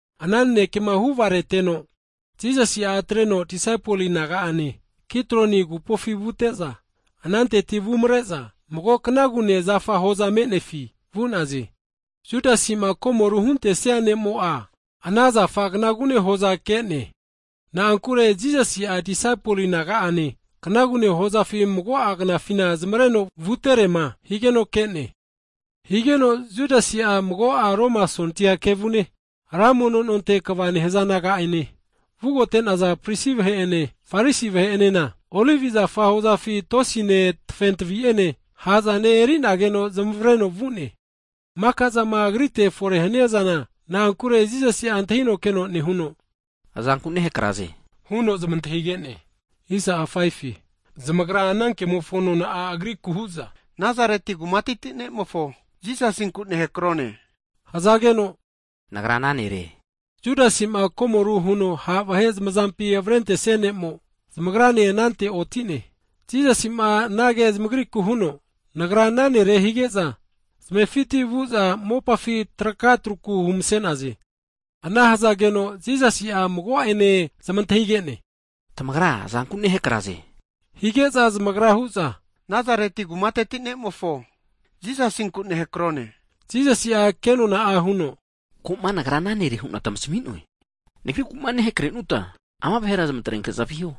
Ana nanekema huvareteno, Jisasi'a atreno disaipol naga'ane Kidron agupofi vute'za, ananteti vumare'za mago knagune zafa hoza me'nefi vu'naze. Judasima komoru huntesia ne'mo'a, ana zafa knagune hoza ke'ne, na'ankure Jisasi'a disaipol naga'ane knagune hozafi mago'a knafina zamareno vutere'ma higeno ke'ne. Higeno Judasi'a mago'a Roma sondia kevune, ra mono nonte kva nehaza naga'ene (Gat), vugote'naza prisi vahe'ene, Farisi vahe'enena olivi zafa hozafi tosine, tafentavi'ene, ha'zane eri'nageno zamavreno vu'ne. Mika'zama Agrite fore haniazana, na'ankure Jisasi antahino keno nehuno, Azanku nehakraze? huno zamantahige'ne. Zamagra ana kemofo nona'a Agriku hu'za, Nazareti kumateti Jisasinku nehakrone, hzageno, Nagra ana Nere. Judasima komoru huno ha' vahe zamazampi avrentesia ne'mo zamagrane anante oti'ne. Jisasi'ma anage zamagriku huno, Nagra ana Nere hige'za, zamefiti vu'za mopafi traka truku humse'naze. Ana hzageno, Jisasi'a mago'ene zamantahige'ne, tamagra azanku nehakraze? Hige'za zamagra hu'za, Nazareti kumateti Jisasinku nehakrone. Jisasi'a ke nona'a huno, Ko'ma Nagra ana Nere hu'na tmasmi'noe, Nagriku'ma nehakrehanuta, ama vahera zamatrenke'za viho.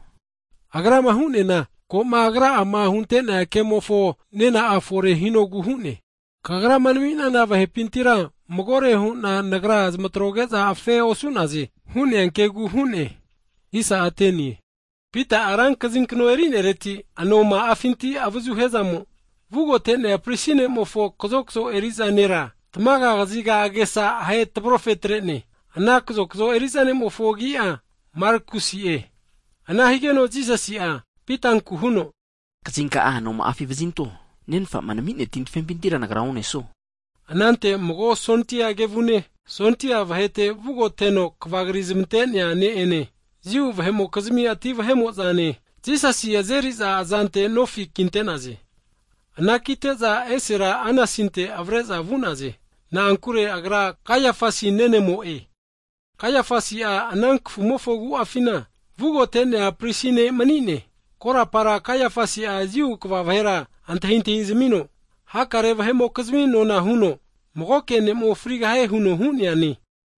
Agrama hu'neana, ko'ma Agra'ama hunte'nea kemofo nena'a fore hinogu hu'ne. Kagrama nami'nana vahepintira magore hu'na Nagra zamatroge'za afe osu'naze, hu'nea kegu hu'ne. Pita'a ra kazinkno (bainat) eri'nereti anoma'afinti avazu hia zamo vugote'nea prisi ne'mofo kazokzo eri'za nera tamaga kaziga agesa ahe tavrofe atre'ne. Ana kazokzo eri'za ne'mofo agi'a Malakusi'e. Ana higeno Jisasi'a, Pitanku huno, Kazinka'a anoma'afi vazinto. Nenfa'ma nami'nea tin tafempintira (kapu) Nagra onesuo? Anante mago sondia kevune, sondia vahete vugota huno kvakri zmante'nea ne'ene, Jiu vahe'mokizmi ati vahe'mo'zane, Jisasi azeri'za azante nofi kinte'naze. Anakite'za esera Anasinte avare'za vu'naze, na'ankure agra Kaiafasi nenemo'e, Kaiafasi'a ana kafumofo agu'afina vugota prisi ne' mani'ne. Korapara Kaiafasi Jiu kva vahera antahintahizamino, hakare vahe'mokizmi nona huno magoke ne'mo frigahie huno hu'neane.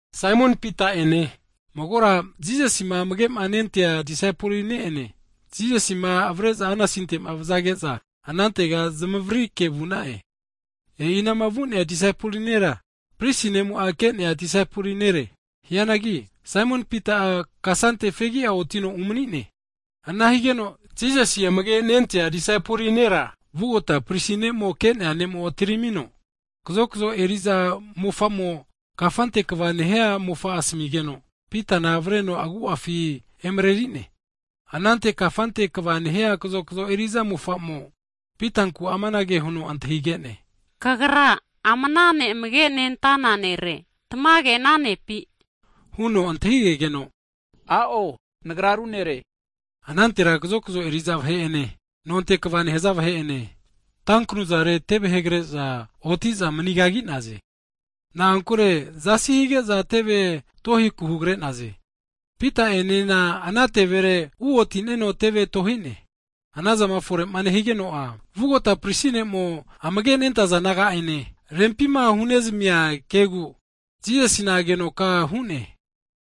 Saimon Pita ene, magora Jisasima amage' nentea disaipoli ne'ene Jisasima avare'za Anasinte vazage'za anantega zamavririke vu'na'e. E'i anama vu'nea disaipoli nera, prisi ne'mo'a ke'nea disaipoli nere. Hianagi, Saimon Pita'a kasante fegi'a otino mani'ne. Ana higeno Jisasi amage' nentea disaipoli nera vugota pris ne'mo ke'nea ne'mo atiramino, kazokzo eri'za mofa'mo kafante kva hu'nea mofa asamigeno, Pitana avreno agu'afi emareri'ne. Anante kazokzo eri'za mofa'ma kafante kva nehia mofa'mo Pitanku amanage huno antahige'ne, Kagra ama Ne' amage' nentana disaipol nere, tamage ana nepi? Huno antahigegeno, A'o, Nagra ru nere. Anantera kazokzo eri'za vahe'ene, nonte kva nehaza vahe'ene, tanknuzare teve hegre'za oti'za mani kagi'naze. Na'ankure zasi hige'za teve tohiku hugre'naze. Pita'enena ana tevere uoti'neno teve tohi'ne. Ana zama fore nehigeno'a, vugota pris ne'mo, amage nentaza disaipol naga'ene, rempi'ma huzami'nea kegu Jisasina agenoka hu'ne.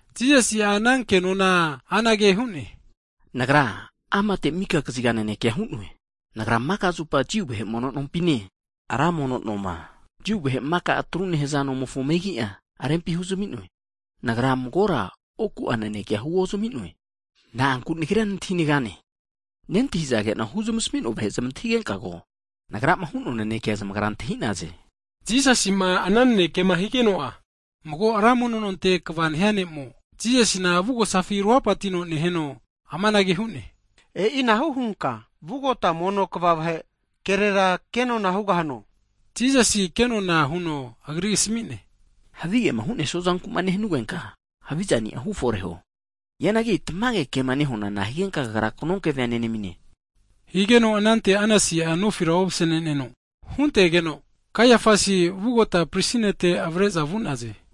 Jisasi ana kenona'a anage hu'ne, Nagra amate mika kaziga naneke hu'noe. Nagra maka zupa Jiu vahe osi mono nompine (sinagog) ra mono noma (tempol), Jiu vahe maka atru nehaza nomofo megi'a rempihuzami'noe, Nagra magore huna oku'a nanekea huozmi'noe. Na'anku Nagria nantahi negane? Nentahizage'na huzmasmi'noa vahe zamantahigenka ko, Nagrama hu'noa nanekea, zamagra antahi'naze. Jisasi'ma ana nanekema higeno'a, mago ra mono nonte kva nehia ne'mo, Jisasina avugosafi ruhapatino neheno amanage hu'ne, E'inahu hunka vugota pris vahe kerera ke nona hugahano? Jisasi ke nona huno agri asmi'ne, Havigema hu'nesua zanku'ma nehanugenka, havizani'a hufore huo, hianagi tamage kema nehuana nahigenka kagra knonkevea nenamine? Higeno anante Anasi'a nofira ovasneno huntegeno, Kaiafasi vugota pris nete avare'za vu'naze.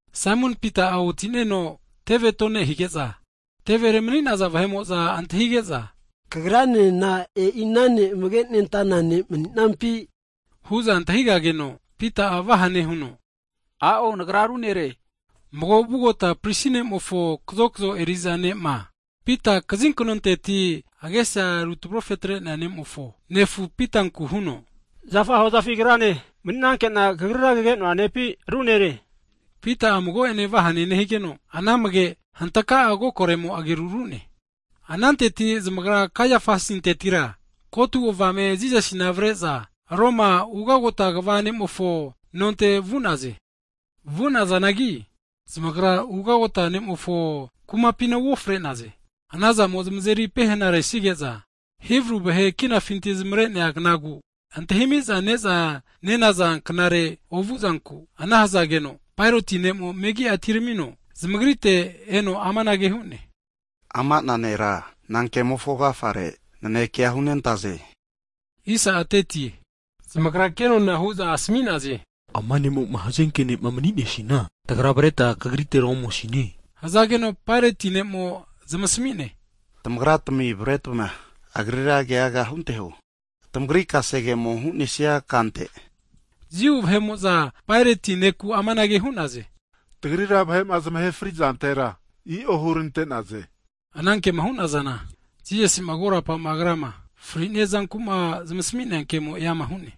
Saimon Pita'a oti'neno teve tonehige'za, tevere mani'naza vahe'mo'za antahige'za, Kagra'nena e'ina ne' amage' nentana disaipol ne' mani'nampi? Hu'za antahigageno, Pita'a vahane huno, A'o nagra ru nere. Mago vugota pris ne'mofo kazokzo eri'za ne'ma, Pita kazi knonteti (bainat) agesa rutavrofe atre'nea ne'mofona nefu' Pitanku huno, Zafa hozafi Agrane mani'nanke'na kagrira kage'noa nepi, ru nere? Higeno, Pita'a mago'ene vahane nehigeno, ana amage hantaka'a, kokoremo ageru ru'ne. Ananteti zamagra Kaiafasintetira ko'atu avame Jisasina avare'za Roma ugagota kva (gavana) ne'mofo nonte vu'naze. Vunazanagi zamagra ugagota nemofo kumapina uofre'naze. Ana zamo zamazeri pehena resige'za, Hibru vahe kinafinti zamare'nea knagu antahimiza neza nenaza knare ovuzanku ana hzageno, Paeroti ne'mo zamagritega megi'a atiramino eno anage hu'ne, Ama'na nera nankemofo agafare nanekea hu'nentaze? Huno zamantahige'ne. Zamagra kenona hu'za asmi'naze, ama ne'mo'ma hazenke ne'ma omni'nesina, tagra avreta kagritera omosine. Hzageno Paeroti'a zamasmi'ne, tamagratami avaretma tamagri kasegemo hu'nesia kante Agrira keaga hunteho. Jiu vahe'mo'za Paerotinku anage hu'naze. Tagrira vahe'ma zamahe fri'zantera i'o hurante'naze. Ana kema hu'nazana, Jisasi'ma korapa Agrama fritenoma otinia zankuma zamasmi'nea kemo e'ama hu'ne.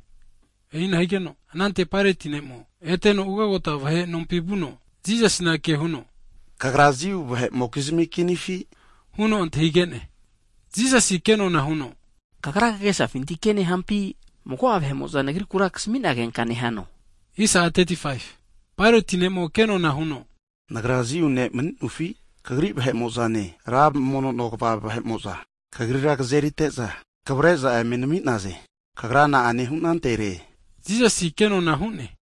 E'ina higeno, anante Paeroti'a eteno ugagota vahe (gavana) nompi vuno, Jisasina kehuno, Kagra Jiu vahe'mokizmi Kinifi? Huno antahige'ne. Jisasi kenona huno, Kagra kagesafinti ke nehampi, mago'a vahe'mo'za Nagri'kura kasmi nagenka nehano? Paeroti'a ke nona huno, Nagra Jiu ne' mani'nofi? Kagri vahe'mo'zane, ra mono kva vahe'mo'za (hai pris) Kagrira kzerite'za, kvare'za eme nami'naze. Kagra na'a hu'nantere? Jisasi ke nona'a hu'ne,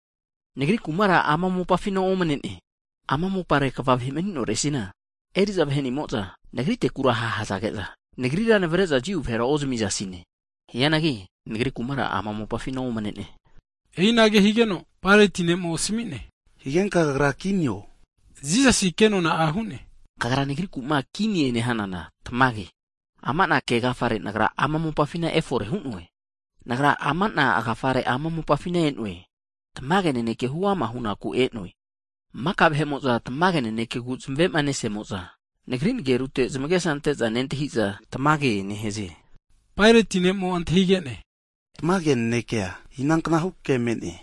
Nagri kumara ama mopafina omne'ne. Ama mopare kva vahe mani'noresina eri'za vahenimo'za, Nagritekura ha' hazage'za, Nagrira navre'za Jiu vahera ozamizasine, hianagi Nagri kumara ama mopafina omne'ne. E'inage higeno Paeroti'a asmi'ne, higenka Kagra kinio? Jisasi ke nona'a hu'ne, Kagra Nagriku'ma kinie nehanana tamage. Ama'na kegafare Nagra ama mopafina efore hu'noe. Nagra ama'na agafare ama mopafina e'noe, tamage naneke huama hunaku e'noe. Maka vahe'mo'za tamage nanekegu zamave'ma nesimo'za, Nagri nagerute zamagesa ante'za nentahiza tamage nehaze. Paeroti'a antahige'ne, tamage nanekea inanknahu ke me'ne?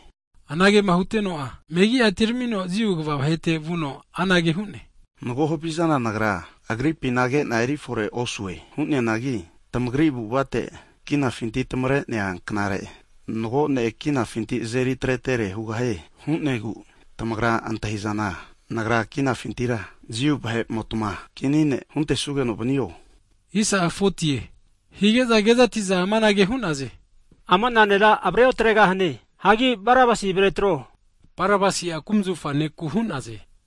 Anagema huteno'a, megi'a atiramino Jiu kva vahete vuno anage hu'ne, Mago havizana nagra, Agripina ke'na erifore osue. Hu'neanagi tamagri avu'avate kinafinti tamavare'nea (Pasova) knare mago ne' kinafinti azeri atretere hugahue hu'negu, tamagra ma antahizana nagra kinafintira, Jiu vahe'motma Kini ne' hunte'sugeno vanio? Hige'za kezati'za amanage hu'naze, Ama'na nera avare otre'gahane, hagi Barabasi avare atro, Barabasi'a kumzafa ne'ku hu'naze.